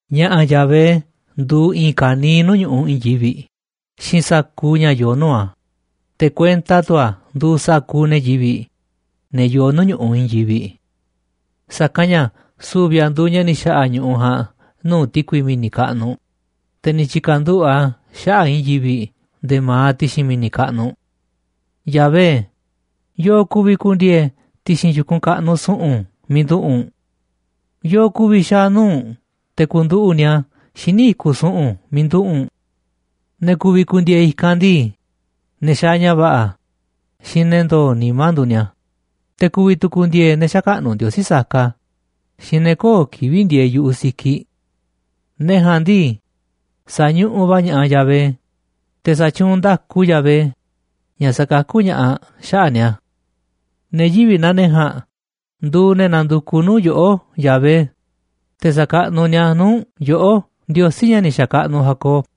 Ña̱ꞌa̱ Yahvé nduuꞌ i̱i̱n ka̱niiꞌ ñu̱ꞌuꞌ i̱i̱n yivi̱ꞌ xiinꞌ sa̱kuuꞌ ña̱ yoo nuu̱ꞌ a̱, te̱ kuenta tu̱ a̱ nduuꞌ sa̱kuuꞌ ne̱ yivi̱ꞌ, ne̱ yoo nuu̱ꞌ ñu̱ꞌuꞌ i̱i̱n yivi̱ꞌ. Sa̱kanꞌ ña̱ su̱vi̱ a̱ nduuꞌ ña̱ ni̱ xa̱ꞌa̱ ñu̱ꞌuꞌ ja̱a̱nꞌ nuu̱ꞌ ti̱kui mi̱ni̱ kaꞌnuꞌ, te̱ ni̱ tyi̱ka̱nduꞌu̱ꞌ a̱ xaꞌa̱ꞌ i̱i̱n yivi̱ꞌ nde̱e̱ ma̱aꞌ ti̱xi̱n mi̱ni̱ kaꞌnuꞌ. Yahvé, ¿yo̱o̱ ku̱vi̱ ku̱ndi̱e̱e̱ ti̱xi̱n yu̱kunꞌ kaꞌnuꞌ su̱ꞌu̱n miiꞌ nduꞌu̱ꞌ u̱n? ¿Yo̱o̱ ku̱vi̱ xaa̱ nuu̱ꞌ u̱nꞌ te̱ ku̱nduꞌu̱ꞌ ni̱a̱ xíniꞌ i̱kuꞌ su̱ꞌu̱n miiꞌ nduꞌu̱ u̱nꞌ? Ne̱ ku̱vi̱ ku̱ndi̱e̱e̱ i̱kanꞌ ndii, ne̱ xaaꞌ ña̱ va̱ꞌa̱ xiinꞌ ne̱ ndo̱o̱ nimá nduuꞌ ni̱a̱, te̱ ku̱vi̱ tu̱ ku̱ndi̱e̱e̱ ne̱ xäkaꞌnuꞌ ndiosí saka xiinꞌ ne̱ köo̱ꞌ kivi̱ꞌ ndieeꞌ yu̱ꞌuꞌ sikiꞌ. Ne̱ ja̱a̱nꞌ ndii, sa̱ñuꞌuꞌ va̱ ña̱ꞌaꞌ Yahvé, te̱ sa̱tyuunꞌ nda̱ku Yahvé, ña̱ sakakú ña̱ꞌaꞌ xaꞌa̱ꞌ ni̱a̱. Ne̱ yivi̱ꞌ naa ne̱ ja̱a̱nꞌ nduuꞌ ne̱ nandukuꞌ nuu̱ꞌ yoꞌó, Yahvé, te̱ sa̱kaꞌnuꞌ ni̱a̱ nuu̱ꞌ u̱nꞌ, yoꞌó, Ndiosí, ña̱ ni̱ xa̱kaꞌnuꞌ Jacob.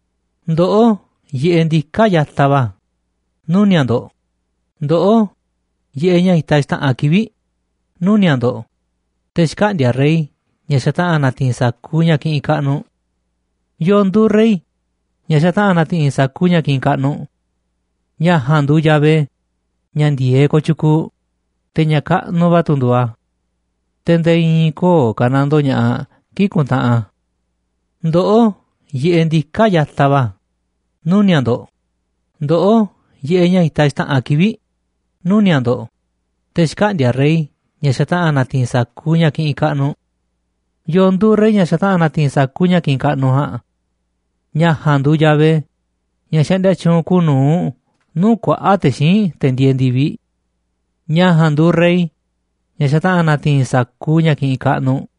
Ndoꞌó, yiꞌeꞌ ndiká ya̱taꞌ va̱, nuni̱a̱ꞌ ndo̱ꞌ, ndoꞌó, yiꞌeꞌ, ña̱ itaꞌ xta̱ꞌanꞌ kivi̱ꞌ, nuni̱a̱ꞌ ndo̱ꞌ, te̱ xkaꞌndi̱a̱ rey, ña̱ xataꞌa̱n na̱ti̱i̱n sa̱kuuꞌ ña̱ kiꞌinꞌ kaꞌnuꞌ. ¿Yo̱o̱ nduuꞌ rey ña̱ xataꞌa̱n na̱ti̱i̱n sa̱kuuꞌ ña̱ kiꞌinꞌ kaꞌnuꞌ? Ña̱ ja̱a̱nꞌ nduuꞌ Yahvé ña̱ ndi̱e̱eꞌ kooꞌ tyukuuꞌ, te̱ ña̱ kaꞌnuꞌ va̱ tu̱ nduuꞌ a̱. Te̱ nde̱e̱ i̱i̱n köo̱ꞌ ka̱nandoo ña̱ꞌaꞌ kii̱ꞌ kuntaꞌanꞌ a̱. Ndoꞌó, yiꞌeꞌ ndiká ya̱taꞌ va̱, nuni̱a̱ꞌ ndo̱ꞌ, ndoꞌó, yiꞌeꞌ, ña̱ itaꞌ xta̱ꞌanꞌ kivi̱ꞌ, nuni̱a̱ꞌ ndo̱ꞌ, te̱ xkaꞌndi̱a̱ rey, ña̱ xataꞌa̱n na̱ti̱i̱n sa̱kuuꞌ ña̱ kiꞌinꞌ kaꞌnuꞌ. ¿Yo̱o̱ nduuꞌ rey, ña̱ xataꞌa̱n na̱ti̱i̱n sa̱kuuꞌ ña̱ kiꞌinꞌ kaꞌnuꞌ ja̱a̱nꞌ? Ña̱ ja̱a̱nꞌ nduuꞌ Yahvé ña̱ xaꞌndia tyuunꞌ kuuꞌ nu̱uꞌ nuu̱ꞌ kuaꞌa̱ꞌ te̱ xíinꞌ te̱ ndieeꞌ ndi̱viꞌ. Ña̱ ja̱a̱nꞌ nduuꞌ rey ña̱ xataꞌa̱n na̱ti̱i̱n sa̱kuuꞌ ña̱ kiꞌinꞌ kaꞌnuꞌ.